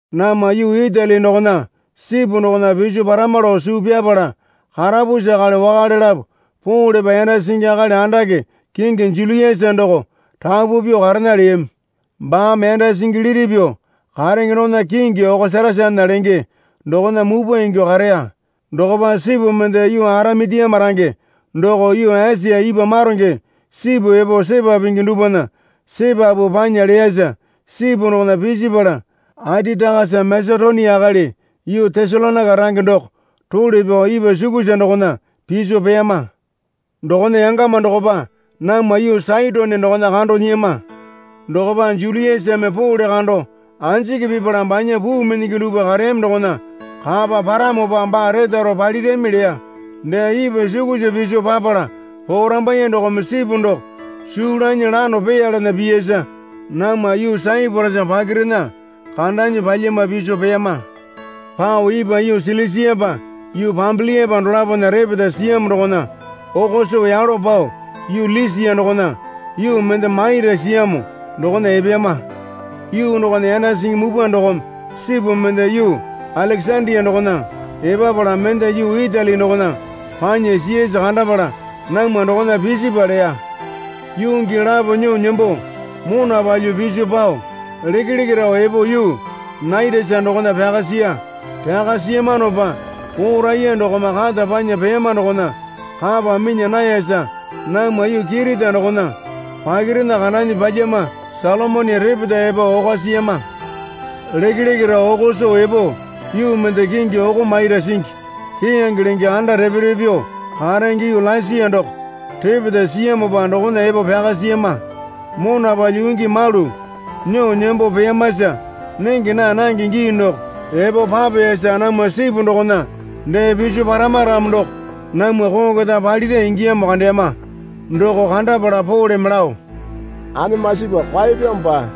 Namwa yuu Itali dokona sipu dokona piso parama lao suu pyapala karapusi akali wakale lapo Polepa yanda singi akali andake kingi Juliasa doko rapu pyuo karena leyami. Baame yanda singi liti pyuo karenge dokona kingi Okosatasana lenge dokona mupwa ingyuo kareya. Dokopa sipu mende yuu Aramitiama range doko yuu Esia ipwa maronge sipu epo sepa pingi dupwana sepapu panya leyasa sipu dokona pisipala Atitakasa Masetonia akali yuu Tesalonaika range doko role pyao ipwa sukusa dokona piso peyama. Dokona yangama dokopa namwa yuu Saitone dokona kando nyiyama. Dokopa Juliasame Pole kando anjiki pipala banya puu minyingi dupwa kareyami dokona kapa paramopa baa retaro palirami leya. Dee ipwa sukusa piso papala porambaiye dokome sipu doko suu lanyi lano peyalena piyasa namwa yuu Saiporasa pakirena kandanyi pyalyama piso peyama. Pao ipwa yuu Silisiapa yuu Pambiliapa dolapona repeta siyamo dokona oko soo yalo pao yuu Lisia dokona yuu mende Maira siyamo dokona epeyama. Yuu dokona yanda singi mupwa dokome sipu mende yuu Alekesandia dokona epapala mende yuu Itali dokona panya siyasa kandapala namwa dokona pisipwa leya. Yuu gii lapo nyuo nembo mona palyuo piso pao lekeleke rao epo yuu Naitasa dokona pyaka siya. Pyaka siyamanopa poo raiya dokome kata panya peyama dokona kapa minya nayasa namwa yuu Kirita dokona pakirena kandanyi pyalyama Salomoni repeta epo oko siyama. Lekeleke rao oko soo epo yuu mende kingi Oko Mairo Singi Keyange lenge anda repe repe pyuo karenge yuu Lasia doko repeta siyamopa dokona epo pyaka siyama. Mona palyuo yuu gii malu nyuo nembo peyamasa nenge naa nange gii doko epo papeyasa namwa sipu dokona dee piso parama ramo doko namwa koo keta palira ingiya kandeyama. Doko kandapala Poleme lao, Anemasipa kwaeyapyamopa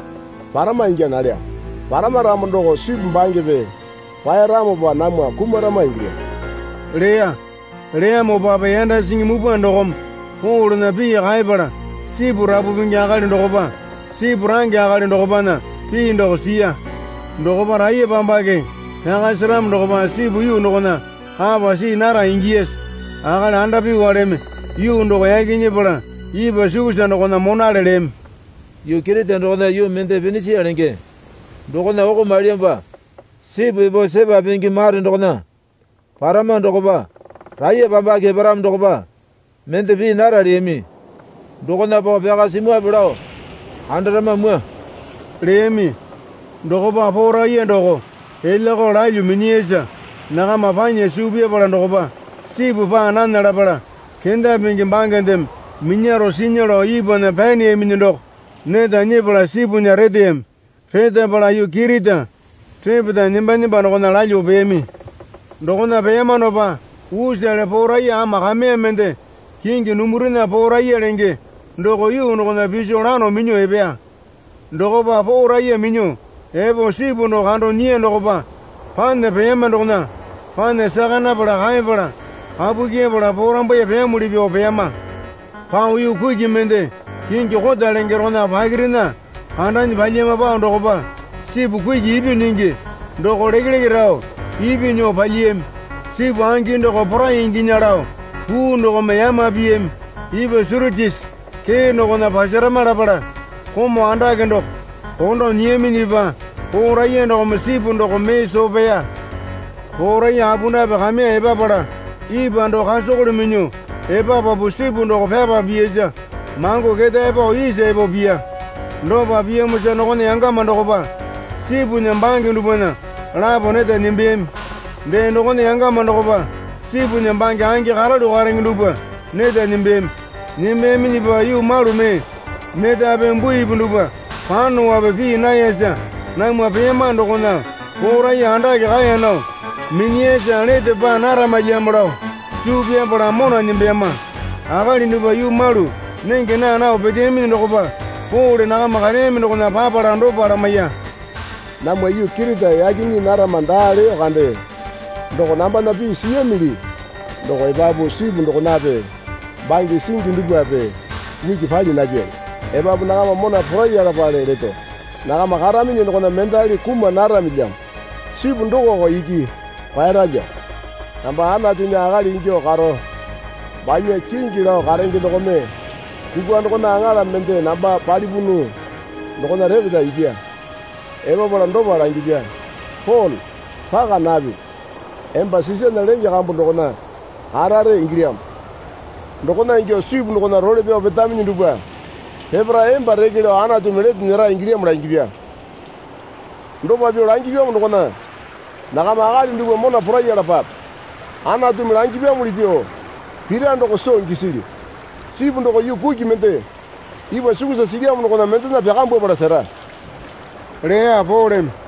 parama ingya nalyamo. Parama ramo doko sipu bangepe kwaeramopa namwa kumarama ingilyamo leya. Leyamopape yanda singi mupwa dokome Polena pii kaepala sipu rapu pingi akali dokopa sipu range akali dokopana pii doko siya. Dokopa raiyepambake pyaka seramo dokopa sipu yuu dokona kapa see nara ingiyasa akali andapyuwaleme, Yuu doko yaki nyepala ipwa sukusa dokona monale leyami. Yuu Kirita dokona yuu mende Pinisia lenge dokona oko mailyamopa sipu epo sepa pingi mare dokona parama dokopa raiyepambake eparamo dokopa mende pii nara leyami. Dokona pao pyaka simwape lao kandarama mwua, leyami. Dokopa poo raiya doko elyakao lalyuo minyiyasa nakama panya suu pyapala dokopa sipu paa nana lapala kenda pingi bangendeme minyaro sinya lao ipwana pyaneyaminyi doko neta nyepala sipunya reteyami. Retapala yuu Kirita repeta nemba nemba dokona lalyuo peyami. Dokona peyamanopa usale poo raiya ama kameya mende kingi Dumurena Poo raiya lenge doko yuu dokona piso lano minyuo epeya. Dokopa poo raiya minyuo epo sipu doko kando nyiya dokopa pana peyama dokona pana saka napala kaepala kapu kyepala porambaiye peyamuli pyuo peyama. Pao yuu kuki mende kingi Kota lenge dokona pakirena kandanyi palyama pao dokopa sipu kuki ipyuo nyingi doko lekeleke rao ipyuo nyuo palyiyami. Sipu angi doko porai inginya lao puu dokome yama piyami. Ipwa Suritisi kee dokona pasarama lapala komau andake doko kondo nyiyaminyipa poo raiya dokome sipu doko mee soo peya. Poo raiya apundape kameya epapala ipwa doko kasakole minyuo epapapu sipu doko pyapa piyasa mango ketae pao isa epo piya. Dopa piyamosa dokona yangama dokopa sipunya bange dupwana lapo neta nembeyami. Dee dokona yangama dokopa sipunya bange angi karalu karenge dupwa neta nembeyami. Nembeyaminyipa yuu malu mee netape buipi dupwa panope pii nayasa namwa peyamano dokona poo raiya andake kaeya nao minyiyasa lete paa naramalyamo lao suu pyapala mona nembeyama, Akali dupwa yuu malu nenge naa nao peteyaminyi dokopa Pole nakama kareyami dokona papala dopa lamaiya. Namwa yuu Kirita yake nyii narama daa leyo kande doko nambana pii siyamili doko epapu sipu dokonape bange singi dupwape uki pali napyali. Epapu nakama mona poraiyalapale leto. Nakama karaminyi dokona mendali kuma naramilyamo. Sipu dokoko iki kwaeyaralyamo. Namba Anatunya akali ingyuo karo banya kingi lao karenge dokome kukwa dokona aŋala mende namba palipunu dokona repeta ipya. Epapala dopa langipya. Pole paka napipi. Emba Sisana lenge kambu dokona karare ingilyamo. Dokona ingyuo sipu dokona role pyao petaminyi dupwa peparae emba reke lao Anatumi lete nyera ingilyamo langipya. Dopa pyuo langipyamo dokona nakama akali dupwa mona poraiyalapape. Anatumi langipyamuli pyuo pira doko soo gisilyu. Sipu doko yuu kuki mende ipwa sukusa silyamo dokona mendena pyakambwapala sera, leya Poleme.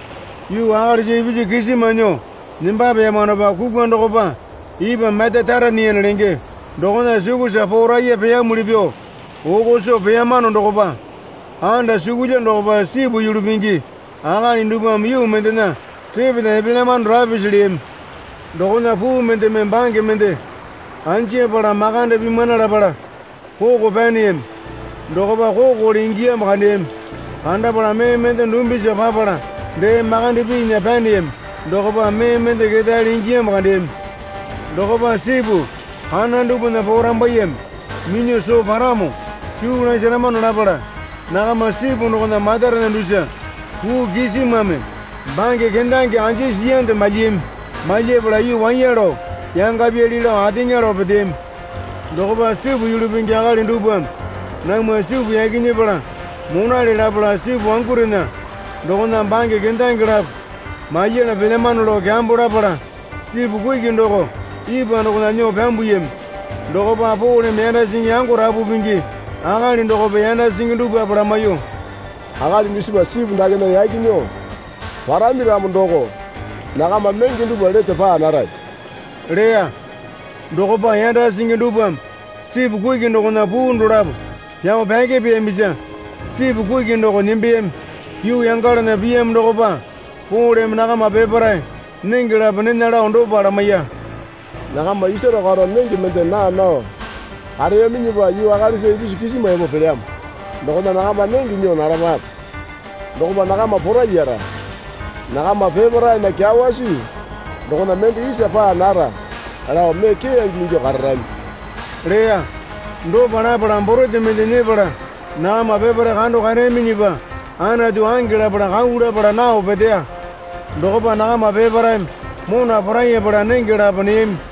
Yuu akalisa ipisu kisima nyuo nembapeyamanopa kukwa dokopa ipwa Metitaraniane lenge dokona sukusa poo raiya peyumuli pyuo oko soo peyamano dokopa andasukulya dokopa sipu yulu pingi akali dupwame yuu mendena repeta epelyamano rapisi leyami. Dokona puu mendeme bange mende anjapala makande pimana lapala koko pyaneyami. Dokopa kokole ingiyamo kandeyami. Kandapala mee mende dumbisa papala dee makande pinya pyaneyami dokopa mee mende ketaele ingiyamo kandeyami. Dokopa sipu kana dupwana porambaiyeme minyuo soo paramo suu lasaramano lapala nakama sipu dokona matarena dusa puu kisimame bange kendange anjisi siyande malyiyami. Malyapala yuu waiya lao yangapyali lao ateŋa lao peteyami. Dokopa sipu yulu pingi akali dupwame namwa sipu yaki nyepala monale lapala sipu wangurena dokona bange kendange lapo malyala pelyamano lao kyambo lapala sipu kuki doko ipwa dokona nyuo pyambuyami. Dokopa Poleme yanda singi yango rapu pingi akali dokope yanda singi dupwape lamaiyuo, Akali dusipa sipu dakena yaki nyuo parami ramo doko nakama menge dupwa lete paa narami leya. Dokopa yanda singi dupwame sipu kuki dokona puu dolapo pyao pyakepeyamisa sipu kuki doko nembeyami. Yuu yangalana piyamo dokopa Poleme nakama peparae nenge lapo nena lao dopa lamaiya. Nakama isaro karo nenge mende naa nao kareyaminyipa yuu akalisa ipisu kisima epo pelyamo. Dokona nakama nenge nyuo nalapape. Dokopa nakama poraiyara. Nakama peparaena kyawasi dokona mende isa paa nara lao mee keyange ingyuo kararami leya. Dopa lapala borete mende nyepala nakama peparae kando kareyaminyipa Anatu ange lapala kau lapala nao peteya. Dokopa nakama peparaeme mona poraiyapala nenge lapo neyami.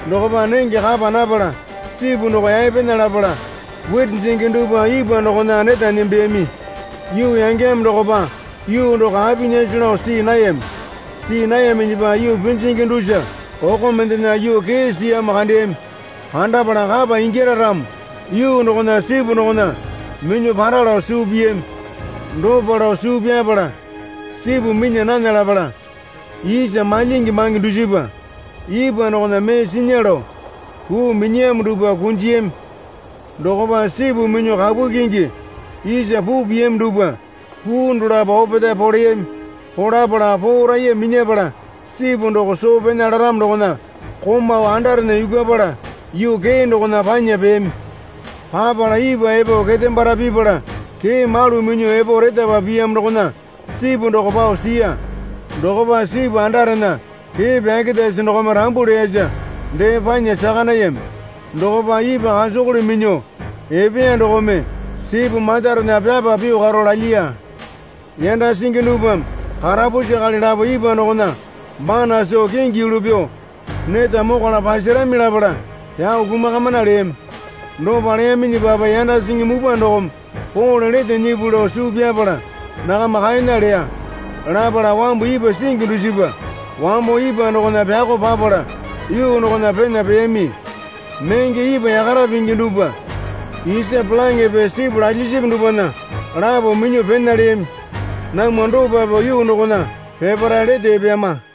Dokopa nenge kapa napala sipu doko yaepena lapala witi jingi dupwa ipwa dokona neta nembeyami. Yuu yangeyamo dokopa yuu doko apinyase lao see nayami. See nayaminyipa yuu pinjingi dusa oko mendena yuu kee siyamo kandeyami. Kandapala kapa ingyara ramo yuu dokona sipu dokona minyuo para lao suu piyami. Dopa lao suu pyapala sipu minya nana lapala isa malyingi bange dusipa ipwa dokona mee sinya lao puu minyiyamo dupwa kunjiyami. Dokopa sipu minyuo kapu kyingi isa puu piyami dupwa puu dolapo opetae poleyami. Polapala poo raiya minyapala sipu doko soo pena laramo dokona komau andarena yukwapala yuu kee dokona panya peyami. Papala ipwa epo ketembara pipala kee malu minyuo epo retapa piyamo dokona sipu doko pao siya. Dokopa sipu andarena kee pyarerasi dokome rambu leyasa dee panya saka nayami. Dokopa ipwa kasakole minyuo epeya dokome sipu matarena pyapa pyuo karo lalyiya. Yanda singi dupwame karapusi akali lapo ipwa dokona bana soo kingi yulu pyuo neta mokwala pasarami lapala pyao kumakamana leyami. Dopa leyaminyipape yanda singi mupwa dokome Pole lete nyipuli lao suu pyapala nakama kaena leya. Lapala wambu ipwa singi dusipa wambo ipwa dokona pyako papala yuu dokona pena peyami. Menge ipwa yakara pingi dupwa isa polaŋepe sipu lalyisipi dupwana lapo minyuo pena leyami. Namwa dopa pyuo yuu dokona peparae lete epeyama.